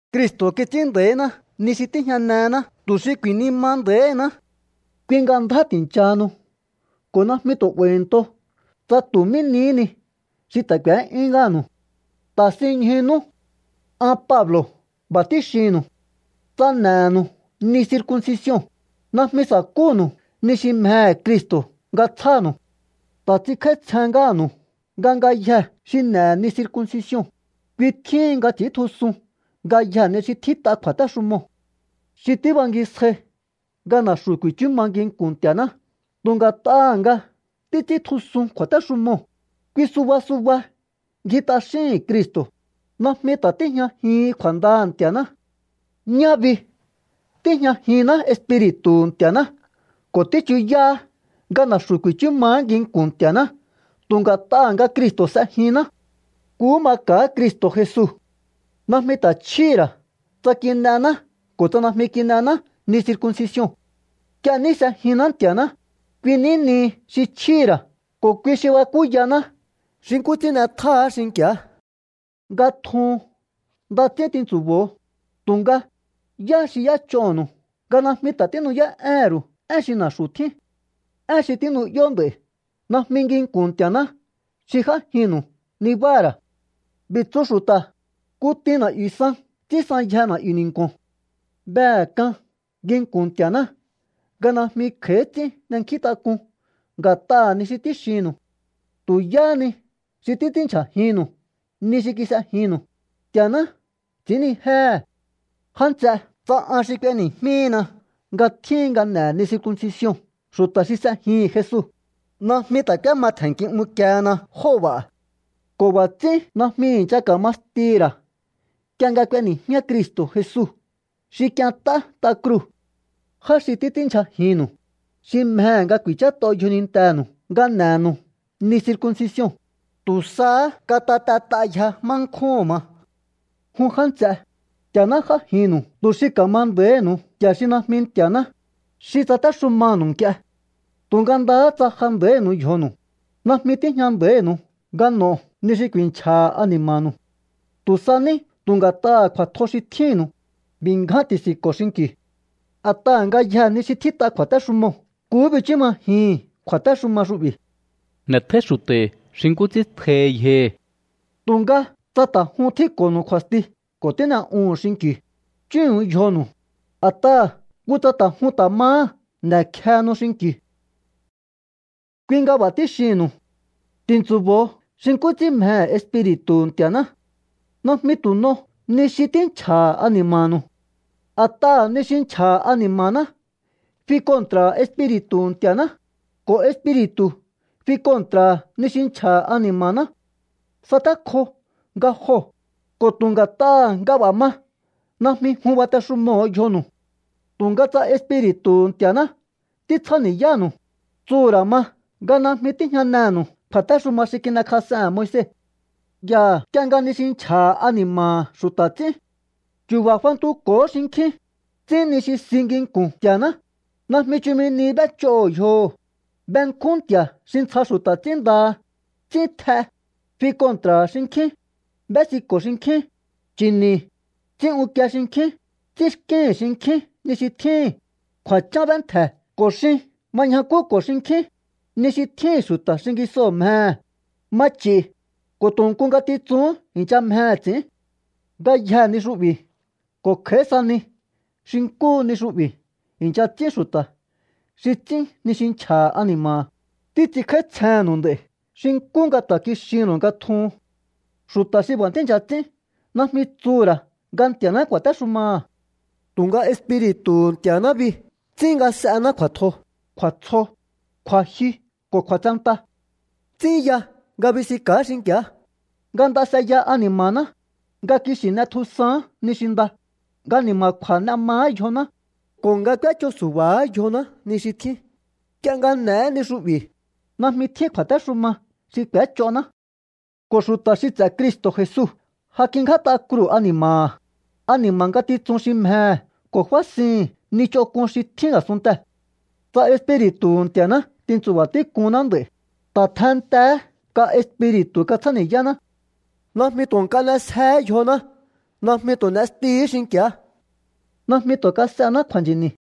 Cristo̱ kits'ín nda̱íná ni xi tíjñanená tu̱ xi ku̱i̱nima nda̱íhiná. Kui nga ndjá ti̱nchahanu ko̱ najmi tu̱ 'ba̱i̱nto tsa tu̱ mí nihí ni xi ta̱ k'u̱é'yún ngáha̱nu̱u. Ta̱sinñjunú. An Pablo̱ b'a̱ tíxinnu̱u. Tsa n'e̱nu̱u ni circuncision, najmi sa̱kúnu̱u ni xi mjehe̱ Cristo̱ nga tsjánu̱u. Ta̱ ts'inkj'áítsjen ngáha̱nu̱u nga ngayjee̱ xi n'e̱he̱ ni circuncision, kui tjíhin nga ts'i̱íntjusun ngayjee̱ ni xi tjít'a kju̱a̱téxumoo̱. Xi tíbangisjai nga na̱xu̱ ku̱i̱chú ma nginku̱n Nti̱a̱ná tu̱ nga̱t'aha̱ nga títs'íntjusun kju̱a̱téxumoo̱, kui suba suba ngji t'axíhi̱n Cristo̱. Najmi ta̱ tíjñajihin kju̱a̱ndaha̱ Nti̱a̱ná. Ñá bi tíjñajinná Espiri̱tu̱hu̱ Nti̱a̱ná ko̱ tíchuyáá nga na̱xu̱ ku̱i̱chú maá nginku̱n Nti̱a̱ná tu̱ nga̱t'aha̱ nga Cristo̱ s'ejinná. Nkuhú maka̱á Cristo̱ Jesu. Najmi ta̱ chjíhi̱ ra̱ tsa kin'ená ko̱ tsa najmi kin'ená ni circuncision. Nk'ie ní s'ejinná Nti̱a̱ná, kui ní nihi xi chjíhi̱ ra̱ ko̱ kui xi bakúyaná xi nkú ts'ín n'etjáá xinki̱á. Nga tjuhun nda ts'ín tintsu̱bo̱o, tu̱nga, ¿yá xi y'éch'onu̱u nga najmi ta̱ tínu'yá'éhe̱n ru̱u én xi na̱xu̱ tjín? Én xi tínu'yó nd'a̱i̱ najmi nginku̱n Nti̱a̱ná xi j'ájinnu̱u nibáha̱ ra̱. B'i̱ tsú xu̱ta̱: “Kutin na̱'yu̱ san ts'ínsanyje na̱'yu̱ ni̱nku̱o̱n.” Behe̱ k'an nginku̱n Nti̱a̱ná nga najmi kj'a̱í ts'ín n'e̱nkjíntak'un nga̱t'aha̱ ni xi tíxinnu̱u. Tu̱ yáhá ni xi títs'ínndyjajinnu̱u ni xi kis'ejinnu̱u, Nti̱a̱ná ts'i̱ínnijéhe̱. Já nts'e, tsa an xi k'ueni̱jmíhina nga tjíhin nga n'e̱he̱ ni circuncision xu̱ta̱ xi s'ejihi̱n Jesu, najmi ta̱ k'úéma tje̱nki unkiehena jóo̱ b'a̱. Ko̱ b'a̱ ts'ín najmi i̱ncha ka̱ma stihi̱ ra̱ nk'ie nga k'ueni̱jmíá Cristo̱ Jesu xi k'ient'á t'a kruu̱. Já xi títs'ínndyjajinnu̱u, xi mjehe̱ nga ku̱i̱chát'o yjonintenu̱u nga n'e̱nu̱u ni circuncision, ¡tu̱ sahá katatet'ayje má nkjúhu̱n ma! Jun já nts'e, Nti̱a̱ná j'ájinnu̱u tu̱ xi ka̱ma nda̱íhi̱nu̱u nti̱a̱ xi najmi Nti̱a̱ná, xi tsatéxumanu̱u nk'ie. Tu̱nga ndaha tsa ja nda̱ínu̱u yjonu̱u, najmi tíjña nda̱ínu̱u nga n'o̱o ni xi ku̱i̱nchja̱ha̱ ani̱ma̱nu̱u. Tu̱ sa ní tu̱ nga̱t'aha̱ kju̱a̱tjo xi tjínnu̱u, b'i̱ ngján ti̱si̱nko̱o xinki̱u. A̱t'aha̱ ngayjee̱ ni xi tjít'a kju̱a̱téxumoo̱ nkuhú bichú majihi̱n kju̱a̱téxuma xu'bi̱: “N'e̱tjóí xu̱ta̱hi̱ xi nkú ts'ín tjohi yjohi̱.” Tu̱nga tsa ta̱ jun tjínko̱nu̱u kju̱a̱sti ko̱ tín'e'uhu̱un xinki̱u, chúhu̱n yjonu̱u, a̱t'aha̱ kutsa ta̱ jun ta̱ mahá n'e̱kjehenu xinki̱u. Kui nga b'a̱ tíxihi̱nnu̱u. Ti̱ntsu̱bo̱o xi nkú ts'ín mjehe̱ Espiri̱tu̱hu̱ Nti̱a̱ná. Najmi tu̱ n'o ni xi tínchja̱ha̱ ani̱ma̱nu̱u. A̱t'aha̱ ni xi nchja̱ha̱ ani̱ma̱ná fi kontra̱ha̱ Espiri̱tu̱hu̱ Nti̱a̱ná, ko̱ Espiri̱tu̱ fi kontra̱ha̱ ni xi nchja̱ha̱ ani̱ma̱ná. Satékjo nga joo̱, ko̱ tu̱ nga̱t'aha̱ nga b'a̱ ma najmi jun batexumoho̱o yjonu̱u. Tu̱nga tsa Espiri̱tu̱hu̱ Nti̱a̱ná títsjáni̱yánu̱u, tsuhu̱ ra̱ ma nga najmi tíjñanenu̱u kju̱a̱téxuma xi kin'ekjas'ehe̱n Moise. Yaha̱ nk'ie nga ni xi nchja̱ha̱ ani̱ma̱ha̱ xu̱ta̱ ts'ín. Chu̱ba̱ fantuko̱hó xinkjín, ts'ín ni xi si nginku̱n Nti̱a̱ná, najmi chumi nihi b'éch'oho̱ yjoho̱, benkjún nti̱a̱ xi ntsja xu̱ta̱ ts'ínndaha, ts'ín tj'e, fi kontra̱ha̱ xinkjín, b'ésiko̱ xinkjín, nchi̱ni̱, ts'ín unkie xinkjín, ts'ínxkíhi̱n xinkjín ni xi tjíhi̱n, kju̱a̱chán b'éntje̱ ko̱ xin ma ñjakúko̱ xinkjín, ni xi tjíhi̱n xu̱ta̱ xingisoo̱ mjehe̱, ma ch'i̱, ko̱ tu̱ nku ngatitsuhún i̱ncha mjehe̱ ts'i̱ín. Ngayjee̱ ni xu'bi̱ ko̱ kj'a̱í sa ni xi nkúhu ni xu'bi̱ i̱ncha ts'ín xu̱ta̱ xi ts'ín ni xi nchja̱ha̱ ani̱ma̱ha̱. Títs'inkj'áítsjennu̱u nd'a̱i̱ xi nkú nga ta̱ kixinnu̱u nga tjuhun. Xu̱ta̱ xi b'a̱ tíi̱ncha ts'ín najmi tsuhu̱ ra̱ nga Nti̱a̱ná ku̱a̱téxumaha̱. Tu̱nga Espiri̱tu̱hu̱ Nti̱a̱ná bi ts'ín s'ená kju̱a̱tjo, kju̱a̱tsjo, kju̱a̱jyu ko̱ kju̱a̱tsenta. Ts'ín ya nga bisinka̱á xinki̱á, nga nda s'eya ani̱ma̱ná, nga kixi̱ n'etjusaán ni xi nda, nga ni̱ma̱kju̱a̱ n'e maá yjoná, ko̱ nga k'úéch'o su̱ba̱áha̱ yjoná ni xi tjín. Nk'ie nga n'e̱é ni xu'bi̱, najmi tjín kju̱a̱téxuma xi k'úéch'oná. Ko̱ xu̱ta̱ xi ts'e̱ Cristo̱ Jesu ja kingját'a kruu̱ ani̱ma̱ha̱, ani̱ma̱ ngatitsun xi mjehe̱ ko̱ fásihi̱n ni ch'onk'un xi tjín a̱sunntee̱. Tsa Espiri̱tu̱hu̱ Nti̱a̱ná tintsu̱ba̱ tík'uhunná nd'a̱i̱, ta̱ tjenntehe̱é nga Espiri̱tu̱ katsjáni̱yáná. Najmi tu̱ nk'a n'esjeé yjoná. Najmi tu̱ n'estihi̱í xinki̱á. Najmi tu̱ kas'ená kju̱a̱nchi̱ni̱.